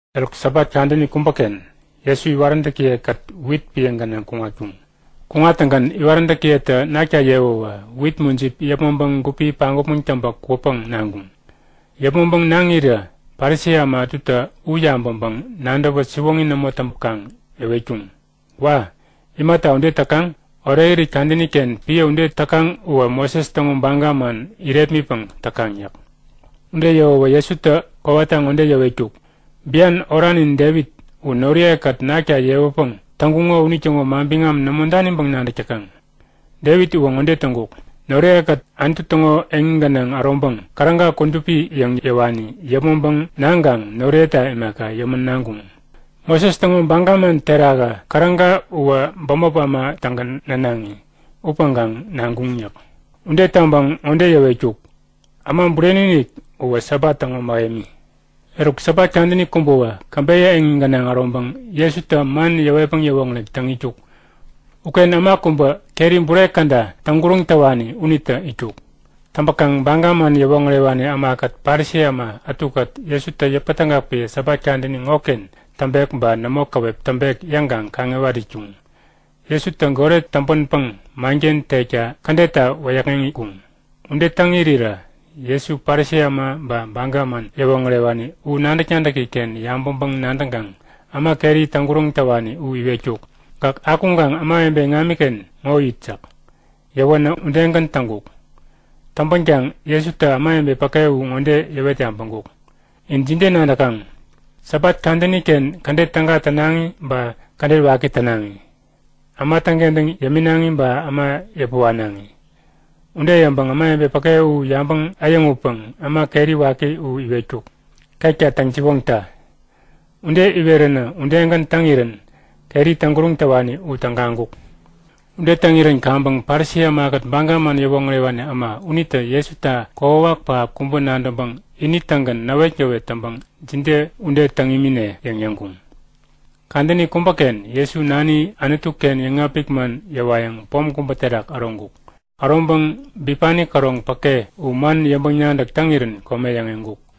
Eruk Sabat kadäni kubäken Jesu iwaräntäkiye-kät wit piä gänaŋ kuŋatkuŋ. Kuŋattäŋgän iwaräntäkiyetä nakta yewäwä wit mujip yäpmäŋpäŋ gupi paŋgupmäŋ täŋpä kwäpäŋ naŋkuŋ. Yäpmäŋpäŋ naŋirä Parisi äma ätutä u yabäŋpäŋ-nadäwä siwoŋi nämo täŋpäkaŋ yäwetkuŋ; Wa! Imata ude täkaŋ? Orekirit kadäni-ken piä ude täkaŋ uwä Moses täŋo baga man irepmitpäŋ täkaŋ yäk. Ude yäwäwä Jesutä kowata ŋode yäwetkuk; Bian oranin Devit u noriye-kät nakta yewäpäŋ täŋkuŋo unitäŋo manbiŋam nämo daniŋpäŋ nadäk täkaŋ? Devit uwä ŋode täŋkuk; Noriye-kät Anutu täŋo eŋi gänaŋ äroŋpäŋ käräga kudupi yäŋ yäwani yäpmäŋpäŋ naŋkaŋ noriyeta imaka, yämän naŋkuŋ. Moses täŋo baga man terakä käräga uwä bämop äma-tägän nänaŋi upäŋkaŋ naŋkuŋ yäk. Ude yäŋpäŋ ŋode yäwetkuk; Äma Bureni-inik uwä Sabat täŋo mähemi. Eruk Sabat kadäni kubätawä käbeyä eŋi gänaŋ äroŋpäŋ Jesutä man yäwetpäŋ yäwoŋärek täŋ itkuk. Uken äma kubä keri bure käda täŋguräŋ täwani unitä itkuk. Täŋpäkaŋ Baga man yäwoŋärewani ämakät Parisi äma ätukät Jesutä yäpätägak piä Sabat kadäni ŋoken täŋpek ba nämo käwep täŋpek yäŋkaŋ kaŋiwat itkuŋ. Jesutä goret täŋpänpäŋ manken tekta kädetta wäyäkŋeŋkuŋ. Ude täŋ irirä Jesu Parisi äma ba Baga man yäwoŋärewani u nadäk-nadäki-ken yabäŋpäŋ-nadäŋkaŋ äma keri täŋguräŋ täwani u iwetkuk; Gäk akuŋkaŋ ämawebe iŋamiken ŋo it yäk. Yäwänä udegän täŋkuk. Täŋpänkaŋ Jesutä ämawebe päke u ŋode yäwet yabäŋkuk; In jide nadäkaŋ? Sabat kadäni-ken kädet täga tänaŋi ba kädet waki tänaŋi? Äma täŋkentäŋ yäminaŋi ba äma yäpä wanaŋi? Ude yäŋpäŋ ämawebe päke u yabäŋ äyäŋutpäŋ äma keri waki u iwetkuk; Ketka täŋ-siwoŋta! Ude iweränä udegän täŋirän keri täŋguräŋ täwani u tägaŋkuk. Ude täŋirän kaŋpäŋ Parisi ämakät Baga man yäwoŋärewani äma unitä Jesuta kokwawak pähap kubä nadäŋpäŋ ini-tägän näwetgäwet täŋpäŋ jide ude täŋ imine? yäŋ yäŋkuŋ. Kadäni kubäken Jesu Nani Anutu-ken yäŋapik man yäwayäŋ pom kubä terak äroŋkuk. Äroŋpäŋ bipani käroŋ päke u man yäŋpäŋ-nadäk täŋirän kome yäŋeŋkuk.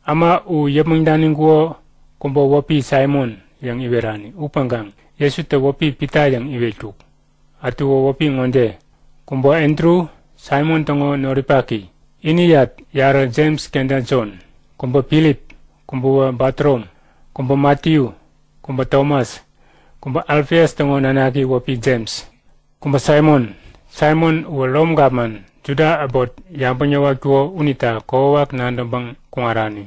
Äma u yäpmäŋ daniŋkuko kubä wäpi Saimon yäŋ iwerani upäŋkaŋ Jesutä wäpi Pita yäŋ iwetkuk. Ätuwä wäpi ŋode; Kubä Andru, Saimon täŋo noripaki. Iniyat yarä Jems kenta Jon. Kubä Filip. Kubäwä Batorom. Kubä Matiyu. Kubä Tomas. Kubä Alfias täŋo nanaki wäpi Jems. Kubä Saimon. Saimon uwä Rom gapman, Juda äbot yabäŋ yäwatkuko unita kokwawak nadäŋpäŋ kuŋarani.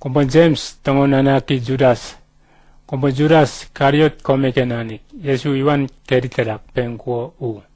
Kubä Jems täŋo nanaki Judas. Kubä Judas, Kariot komeken nanik, Jesu iwan keri terak peŋkuko u.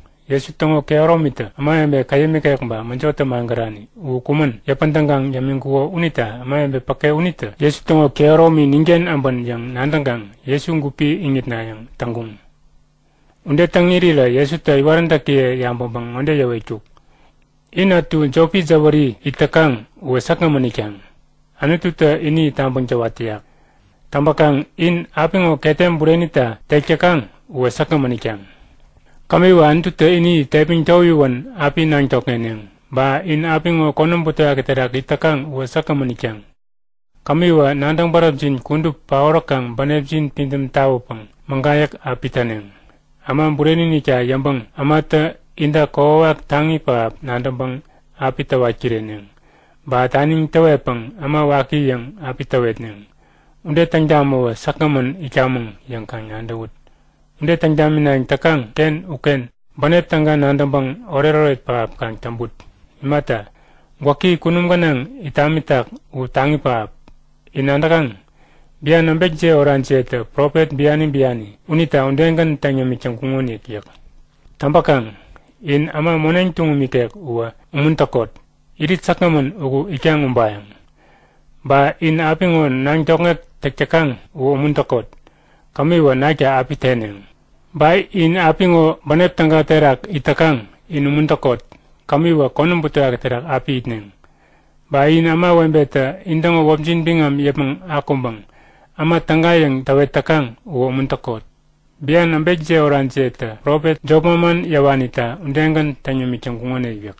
Jesu täŋo kehäromitä ämawebe käyäm ikek ba mäjotä magärani u kumän yäpän tägaŋ yämiŋkuko unita ämawebe päke unitä Jesu täŋo kehäromi ninken äbän yäŋ nadäŋkaŋ Jesu gupi iŋitnayäŋ täŋkuŋ. Ude täŋ irirä Jesutä iwaräntäkiye yabäŋpäŋ ŋode yäwetkuk; In ätu jopi jäwäri it täkaŋ uwä säkgämän itkaŋ. Anututä ini tabäŋ täwat täyak. Täŋpäkaŋ in apiŋo ketem burenita tek täkaŋ uwä säkgämän itkaŋ. Kämiwä Anututä ini tepmäŋ towiwän api naŋ tokŋeneŋ. Ba in apiŋo konäm butewaki terak it täkaŋ uwä säkgämän itkaŋ. Kämiwä nadäŋ bäräpjin kudup paoräkaŋ bänepjin pidäm tawäpäŋ mägayäk api täneŋ. Äma Bureni-inikta yäŋpäŋ ämatä inta kokwawak taŋi pähap nadäŋpäŋ api täwat kireneŋ. Ba taniŋ täwetpäŋ äma waki yäŋ api täwetneŋ. Ude täŋ tamäwä säkgämän itkamäŋ yäŋ kaŋ nadäwut. Ude täŋ taminayäŋ täkaŋ-ken uken bänep täga nadäŋpäŋ oretoret pähap kaŋ täŋput. Imata, gwäki kunum gänaŋ it tamitak u taŋi pähap. In nadäkaŋ? Bian äbekjiye orajiyetä profet biani biani unita udegän täŋ yämik täŋkuŋonik yäk. Täŋpäkaŋ, in äma moneŋ tuŋum ikek uwä umuntäkot! Irit säkgämän uku itkaŋ ubayäŋ. Ba in apiŋo naŋ tokŋek täk täkaŋ uwä umuntäkot! Kämiwä nakta api teneŋ. Ba in apiŋo bänep täga terak it täkaŋ in umuntäkot! Kämiwä konäm butewaki terak api itneŋ. Ba in ämawebetä intäŋo wäpjin biŋam yäpmäŋ akuŋpäŋ äma täga yäŋ täwet täkaŋ uwä umuntäkot! Bian äbekiye oraniyetä profet jop manman yäwanita udegän täŋ yämik täŋkuŋonik yäk.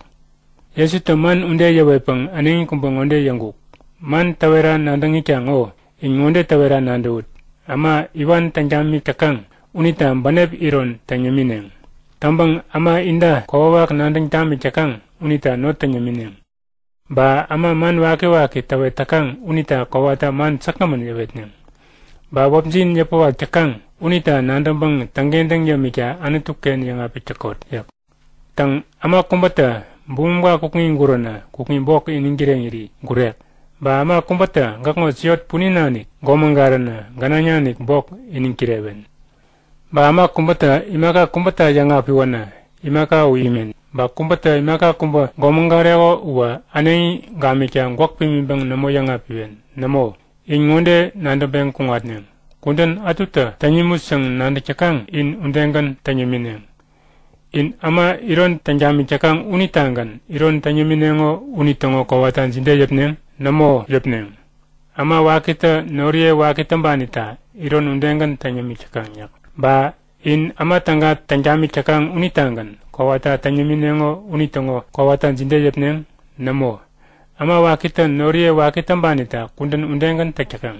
Jesutä man ude yäwetpäŋ äneŋi kubä ŋode yäŋkuk. Man täwera nadäŋ itkaŋ ŋo, in ŋode täwera nadäwut; Äma iwan täŋ tamik täkaŋ unita bänep iron täŋ yämineŋ. Täŋpäŋ äma inta kokwawak nadäŋ tamik täkaŋ unita not täŋ yämineŋ. Ba äma man wakiwaki täwet täkaŋ unita kowata man säkgämän yäwetneŋ. Ba wäpjin yäpäwak täkaŋ unita nadäŋpäŋ täŋkentäŋ yämikta Anutu-ken yäŋapik täkot yäk. Täŋ, äma kubätä bumumka kukŋi guränä kukŋi bok iniŋ kireŋiri gurek. Ba äma kubätä gäkŋo siot punin nanik gomägaränä gänaŋ nanik bok iniŋ kirewen. Ba äma kubätä imaka kubäta yäŋapiwänä imaka u imen. Ba kubätä imaka kubä gomägareko uwä äneŋi gamikta gwäk pimiŋpäŋ nämo yäŋapiwen. Nämo, in ŋode nadäŋpeŋ kuŋatneŋ; Kudän ätutä täŋ nimut yäŋ nadäk täkaŋ in udegän täŋ yämineŋ. In äma iron täŋ tamik täkaŋ unitagän iron täŋ yämineŋo unitäŋo kowata jide yäpneŋ? Nämo yäpneŋ! Äma wakitä noriye waki täŋpanita iron udegän täŋ yämik täkaŋ yäk. Ba in äma täga täŋ tamik täkaŋ unitagän kowata täŋ yämineŋo unitäŋo kowata jide yäpneŋ? Nämo! Äma wakitä noriye waki täŋpanita kudän udegän täk täkaŋ.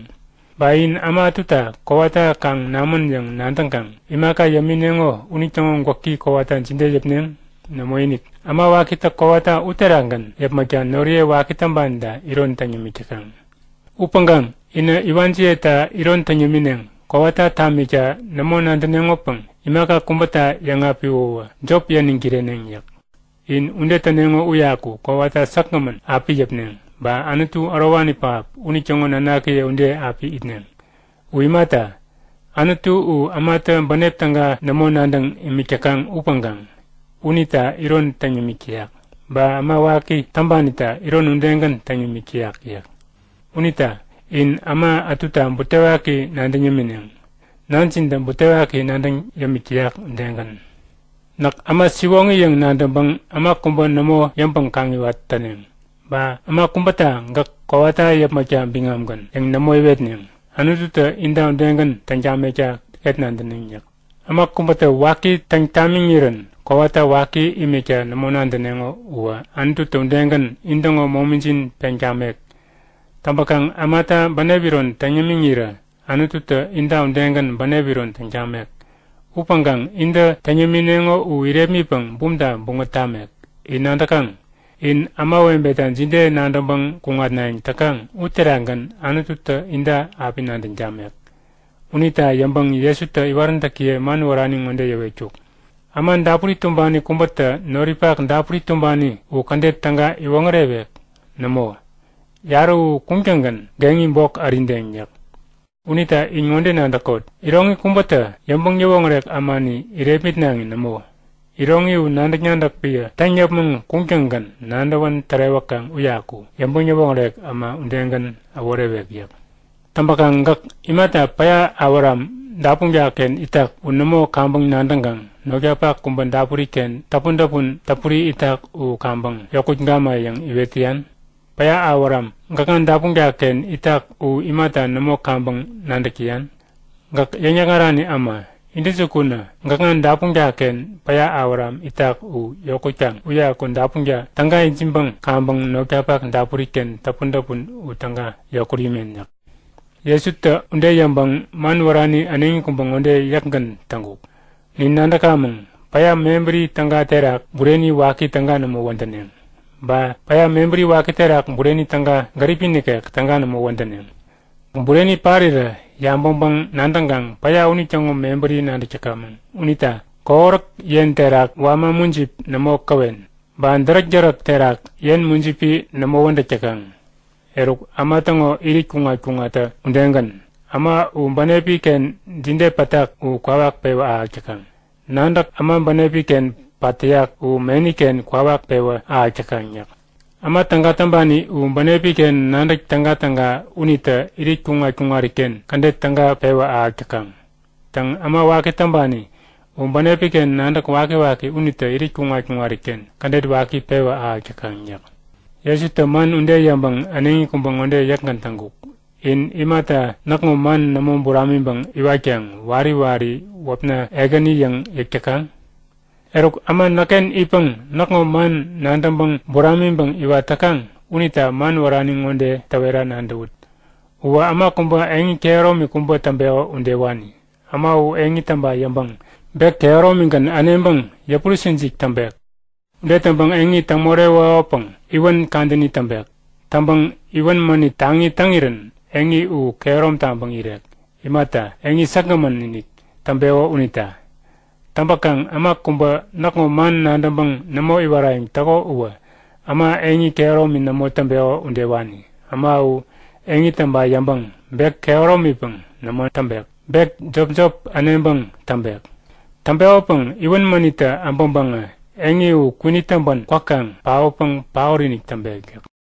Ba in äma ätuta kowata kaŋ namän yäŋ nadäŋkaŋ imaka yämineŋo unitäŋo gwäki kowata jide yäpneŋ? Nämoinik! Äma wakitä kowata uterakgän yäpmäkta noriye waki täŋpanita iron täŋ yämik täkaŋ! Upäŋkaŋ inä iwanjiyeta iron täŋ yämineŋ. Kowata tamikta nämo nadäneŋopäŋ imaka kubäta yäŋapiwäwä jop yäniŋ kireneŋ yäk. In ude täneŋo uyaku kowata säkgämän api yäpneŋ ba Anutu Ärowani Pähap unitäŋo nanakiye ude api itneŋ. U Imata? Anutu u ämatä bänep täga nämo nadäŋ imik täkaŋ upäŋkaŋ unita iron täŋ yämik täyak. Ba äma waki täŋpanita iron udegän täŋ yämik täyak yäk. Unita in äma ätuta butewaki nadäŋ yämineŋ, Nanjintä butewaki nadäŋ yämik täyak udegän. Näk äma siwoŋi yäŋ nadäŋpäŋ äma kubä nämo yäŋpäŋ-kaŋiwat täneŋ. Ba äma kubäta gäk kowata yäpmäkta biŋamgän yäŋ nämo iwetneŋ. Anututä inta udegän täŋ tamekta ket nadäneŋ yäk. Äma kubätä waki täŋ tamiŋirän kowata waki imikta nämo nadäneŋo uwä Anututä udegän intäŋo momijin peŋ tamek. Täŋpäkaŋ ämata bänep iron täŋ yämiŋirä Anututä inta udegän bänep iron täŋ tamek. Upäŋkaŋ intä täŋ yämineŋo u irepmitpäŋ bumta buŋät tamek. In nadäkaŋ? In ämawebeta jide nadäŋpäŋ kuŋatnayäŋ täkaŋ uterakgän Anututä inta api nadäŋ tamek. Unita yäŋpäŋ Jesutä iwaräntäkiye man wärani ŋode yäwetkuk; Äma dapuri tumbani kubätä noripak dapuri tumbani u kädet täga iwoŋärewek? Nämo, yarä u kuŋtäŋgän geŋi bok ärideŋ yäk. Unita in ŋode nadäkot; Iroŋi kubätä yäŋpäŋ-yäwoŋärek ämani irepmitnaŋi nämo. Iroŋi u nadäk-nadäk piä täŋ yäpmäŋ kuŋtäŋgän nadäwän tärewäkaŋ uyaku yäŋpäŋ-yäwoŋärek äma udegänä äworewek yäk. Täŋpäkaŋ gäk imata päya awäram dapunka-ken itak u nämo kaŋpäŋ nadäŋkaŋ notkapak kubä dapuri-ken täpun-täpun täpuri itak u kaŋpäŋ yokut gama yäŋ iwet täyan? Päya awäram gäkŋa dapunka-ken itak u imata nämo kaŋpäŋ nadäk täyan? Gäk yäŋ-yäkŋarani äma! Intäjukunä, gäkŋa dapunka-ken päya äwaram itak u yokutkaŋ uyaku dapunka täga ijiŋpäŋ kaŋpäŋ notkapak dapuri-ken täpun-täpun u täga yokut imen! yäk. Jesutä ude yäŋpäŋ man wärani äneŋi kubä ŋode yäkgän täŋkuk; Nin nadäkamäŋ; Päya mebäri täga terak, bureni waki täga nämo wädäneŋ. Ba päya mebäri waki terak bureni täga gäripi nikek, täga nämo wädäneŋ. Bureni, päya terak mujipi parirä yabäŋpäŋ-nadäŋkaŋ päya unitäŋo mebäri nadäk täkamäŋ. Unita kohoräk yen terak wama mujipi nämo käwen. Ba däräk-däräk terak yen mujipi nämo wädäk täkaŋ. Eruk äma täŋo irit kuŋat-kuŋattä udegän, äma u bänepi-ken jide pätak u kwawak pewä ahäk täkaŋ. Nadäk äma bänepi-ken pat täyak u meni-ken kwawak pewä ahäk täkaŋ yäk. Äma täga täŋpani u bänepi-ken nadäk tägatäga unitä irit kuŋat-kuŋariken kädet täga pewä ahäk täkaŋ. Täŋ, äma waki täŋpani u bänepi-ken nadäk wakiwaki unitä irit kuŋat-kuŋariken kädet waki pewä ahäk täkaŋ yäk. Jesutä man ude yäŋpäŋ äneŋi kubä ŋode yäkgän täŋkuk; In imata näkŋo man nämo buramiŋpäŋ iwatkaŋ wari wari wäpna Ekäni yäŋ yäk täkaŋ? Eruk, äma näkken itpäŋ näkŋo man nadäŋpäŋ buramiŋpäŋ iwat täkaŋ unita man wärani ŋode täwera nadäwut; Uwä äma kubä eŋi kehäromi kubä täŋpeko udewani. Äma u eŋi täŋpa yäŋpäŋ bek käroŋigän äneŋpäŋ yäpurä-sinsik täŋpek. Ude täŋpäŋ eŋi täŋ morewekopäŋ iwän kadäni täŋpek. Täŋpäŋ iwän mänit taŋi täŋirän eŋi u kehärom taŋpäŋ irek. Imata, eŋi säkgämän-inik täŋpeko unita. Täŋpäkaŋ äma kubä näkŋo man nadäŋpäŋ nämo iwarayäŋ täko uwä äma eŋi kehäromi nämo täŋpeko udewani. Äma u eŋi täŋpa yäŋpäŋ bek kehäromipäŋ nämo täŋpek. Bek jopjop äneŋpäŋ täŋpek. Täŋpekopäŋ iwän mänittä äbäŋpäŋä eŋi u kwinit täŋpän kwäkaŋ paotpäŋ paot-inik täŋpek yäk.